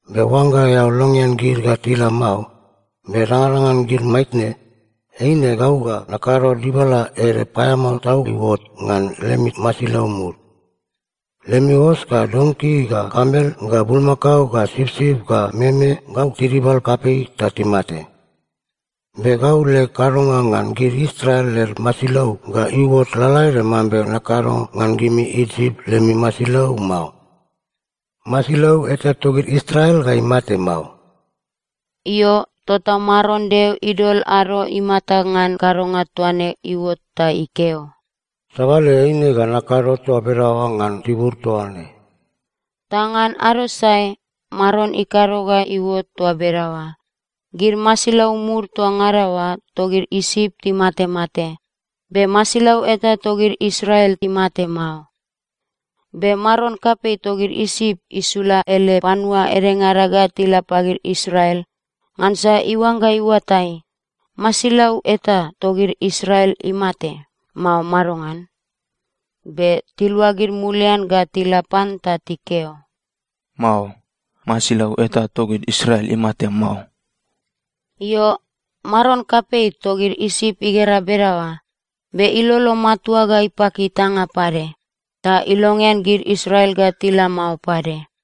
Be oangga eao longean gid ga tila mao, be dangadangan gid maitne, eine gau ga nakado dibala ede paeamao tau iuot ngan lemi masilau mud. Lemi os ga donki ga kamel ga bulmakao ga sipsip ga meme gau tidibal kapei ta timate. Be gau leg kadonga ngan gid Israel led masilau ga iuot lalaede mambe nakado ngan gimi Isip lemi masilau mao. Masilau eta togid Israel ga imate mao.’” Io, tota Maron Deo idol ado imata ngan kadonga toa ne iuot ta ikeo, “Sabale eine ga nakado toa bedaoa ngan tibur toa ne.” Ta ngan ado sae Maron ikado ga iuot toa bedaoa. Gid masilau mud toa ngada oa togid Isip timatemate. Be masilau eta togid Israel imate mao. Be maron kapei togid Isip isula ele panua edengada ga tila pagid Israel, ngansa iuangga iuatai: masilau eta togid Israel imate, mao madongan. Be tiluagid mulian ga tila pan ta tikeo, “Mao. Masilau eta togid Israel imate mao.” Io, maron kapei togid Isip igera bedaoa, be ilolo matua ga ipaki itanga pade, ta ilongean gid Israel ga tila mao pade.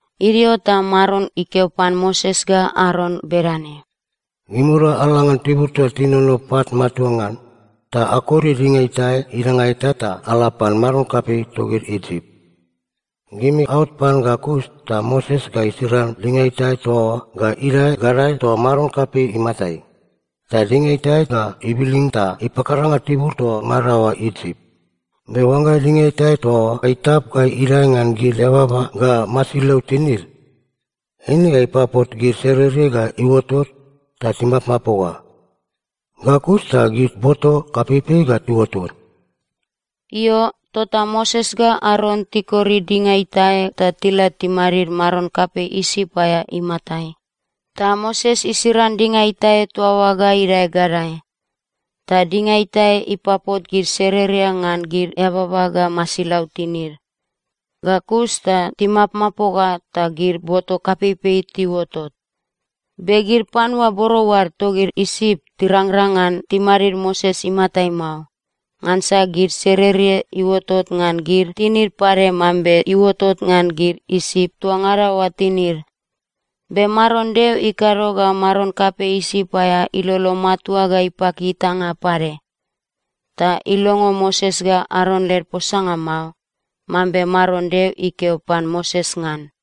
Idio ta Maron ikeo pan Moses ga Aron bedane, “Gimirua ala ngan tibur toa tinono pat matua ngan, ta akori dinga itae idanga eta ta ala pan maron kapei togid Isip. Gimi aot pan ga kus ta Moses ga isiran dinga itae toa oa ga idae gadae toa maron kapei imatai. Ta dinga itae ga ibilin ta ipakaranga tibur toa ngada oa Isip. Be oangga dinga itae toa oa itap ga idae ngan gid eababa ga masilau tinid, eine ga ipapot gid sererie ga iuotot ta timapmapoga. Ga kus ta gid boto kapeipei ga iuotot.” Io, tota Moses ga Aron tikori dinga itae ta tila timadid maron kapei Isip aea imatai, ta Moses isiran dinga itae toa oa ga idae gadae. Ta dinga itae ipapot gid sererie ngan gid eababa ga masilau tinid. Ga kus ta timapmapoga ta gid boto kapeipei tiuotot. Be gid panua borou ad togid Isip tirangrang ngan timadid Moses imatai mao, ngansa gid sererie iuotot ngan gid tinid pade mambe iuotot ngan gid Isip toa ngada oa tinid. Be Maron Deo ikado ga maron kapei Isip aea ilolo matua ga ipaki itanga pade. Ta ilongo Moses ga Aron led posanga mao, mambe Maron Deo ikeo pan Moses ngan.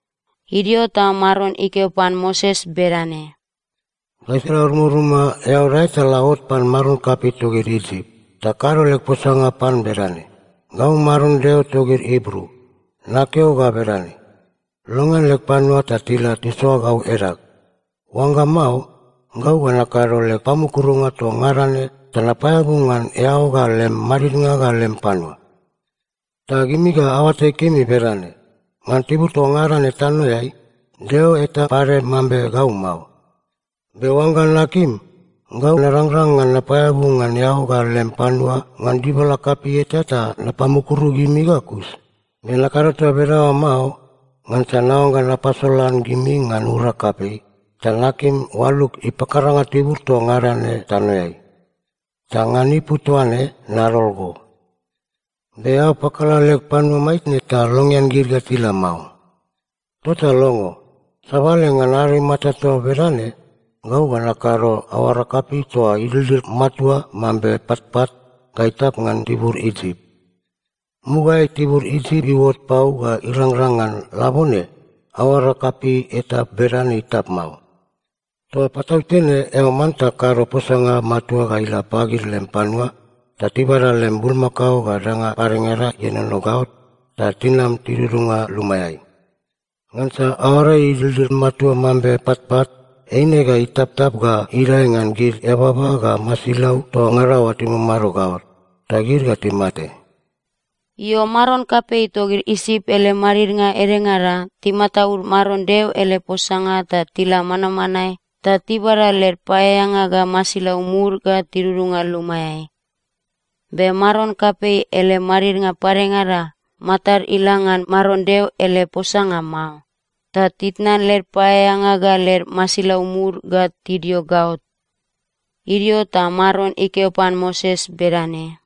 Idio ta Maron ikeo pan Moses bedane, “Gaisala rumaruma eao dae ta la ot pan maron kapei togid Isip, ta kado leg posanga pan bedane, ‘Gau Maron Deo togid Ibru. Nakeo ga bedane: Longean leg panua ta tila tisoa gau edag. Oangga mao, gau ga nakado leg pamukurunga toa ngada ne ta napaeabu ngan eao ga lem madidnga ga lem panua. Ta gimi ga aoatai kemi bedane: Ngan tibur toa ngada ne tanoeai, deo eta pade mambe gau mao. Be oangga nakim, gau narangrang ngan napaeabu ngan eao ga lem panua ngan dibala kapei eta ta napamukuru gimi ga kus. Be nakado toa bedaoa mao ngansa naoangga napasolan gimi ngan urag kapei, ta nakim oalug ipakaranga tibur toa ngada ne tanoeai. Ta ngan ipu toaine nadol go. Be eao pakala leg panua maitne ta longean gid ga tila mao. Tota longo. Sabale ngan ado imata toa bedane, gau ga nakado aoara kapei toa idildil matua mambe patpat ga itap ngan tibur Isip. Mugaeai, tibur Isip iuot pau ga irangrang ngan labone, aoara kapei eta bedane itap mao. Toa patautene eao manta kado posanga matua ga ila pagid lem panua ta tibada lem bulmakao ga danga padengada ienono gaot, ta tinam tidudunga lumaeai. Ngansa aoara idildil matua mambe patpat eine ga itaptap ga idae ngan gid eababa ga masilau toa ngada oa timamado gaot. Ta gid ga timate.’” Io, maron kapei togid Isip ele madidnga edengada timataud Maron Deo ele posanga ta tila manmanae ta tibada led paeaeanga ga masilau mud ga tidudunga lumaeai. Be maron kapei ele madidnga padengada matad ila ngan Maron Deo ele posanga mao, ta titnan led paeaeanga ga led masilau mud ga tidio gaot. Idio ta Maron ikeo pan Moses bedane,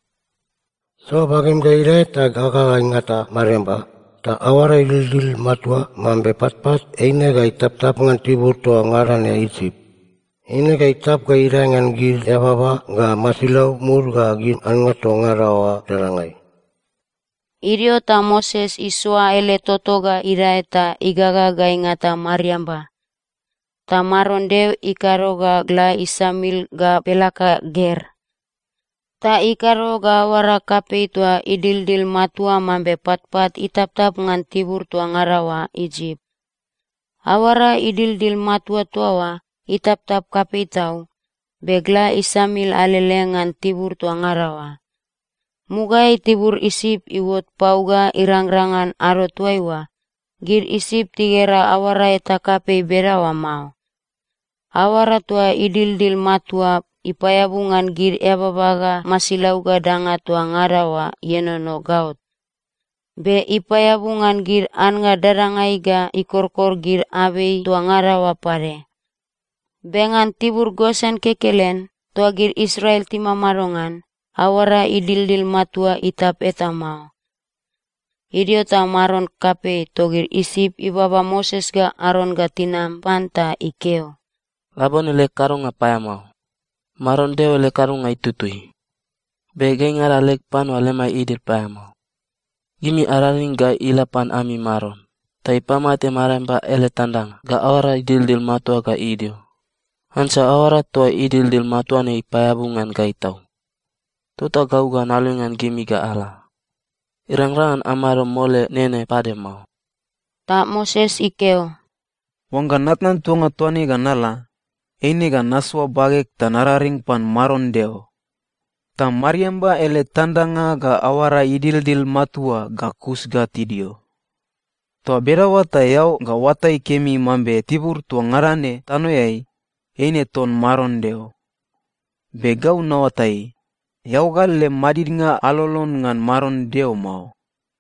“Soa bagem ga idae ta gaga ga ingata mariamba, ta aoara idildil matua mambe patpat eine ga itaptap ngan tibur toa ngada ne Isip. Eine ga itap ga idae ngan gid eababa ga masilau mud ga gid annga toa ngada oa dadangai.” Idio ta Moses isoa ele toto ga idae ta igaga ga ingata mariamba, ta Maron Deo ikado ga gla isamil ga pelaka ger. Ta ikado ga aoara kapei toa idildil matua mambe patpat itaptap ngan tibur toa ngada oa Isip. Aoara idildil matua toa oa itaptap kapei tau, be gla isamil alele ngan tibur toa ngada oa. Mugaeai, tibur Isip iuot pau ga irangrang ngan ado toaiua, gid Isip tigera aoara eta kapei bedaoa mao. Aoara toa idildil matua ipaeabu ngan gid eababa ga masilau ga danga toa ngada oa ienono gaot. Be ipaeabu ngan gid annga dadangai ga ikorkor gid abei toa ngada oa pade. Be ngan tibur Gosen kekelen, toa gid Israel timamado ngan, aoara idildil matua itap eta mao. Idio ta maron kapei togid Isip ibaba Moses ga Aron ga tinam pan ta ikeo, “Labone leg kadonga paeamao. Maron Deo ele kadonga itutui, be gaingada leg panua lemai idil paeamao. Gimi araring ga ila pan ami Maron ta ipamate mariamba ele tandanga ga aoara idildil matua ga idio. Ngansa aoara toa idildil matua ne ipaeabu ngan gai tau. Tota gau ga nalongean gimi ga ala. Irangrang ngan amado mole nene pade mao.” Ta Moses ikeo, “Oangga natnan tuanga toa ne ga nala, eine ga nasoa bageg ta nararing pan Maron Deo. Ta mariamba ele tandanga ga aoara idildil matua ga kus ga tidio. Toa bedaoa ta eao ga oatai kemi mambe tibur toa ngada ne tanoeai, eine ton Maron Deo. Be gau naoatai, eao ga lem madidnga alolon ngan Maron Deo mao.”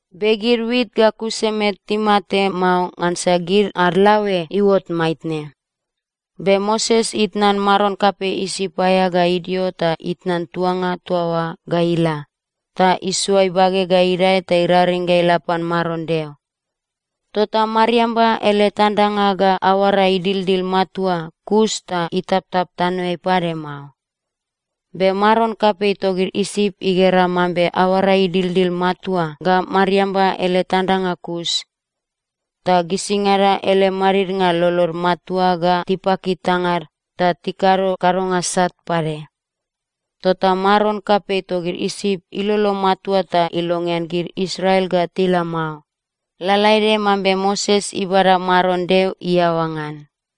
Be gid wit ga kusemet timate mao, ngansa gid ad laoe iuot maitne. Be Moses itnan maron kapei Isip aea ga idio ta itnan tuanga toa oa ga ila, ta isoa ibage ga idae ta iraring ga ila pan Maron Deo. Tota mariamba ele tandanga ga aoara idildil matua kus ta itaptap tanoeai pade mao. Be maron kapei togid Isip igera mambe aoara idildil matua ga mariamba ele tandanga kus, ta gisingada ele madidnga lolod matua ga tipaki tangad ta tikado kadonga sat pade. Tota maron kapei togid Isip ilolo matua ta ilongean gid Israel ga tila mao, lalaede mambe Moses ibada Maron Deo iaoa ngan.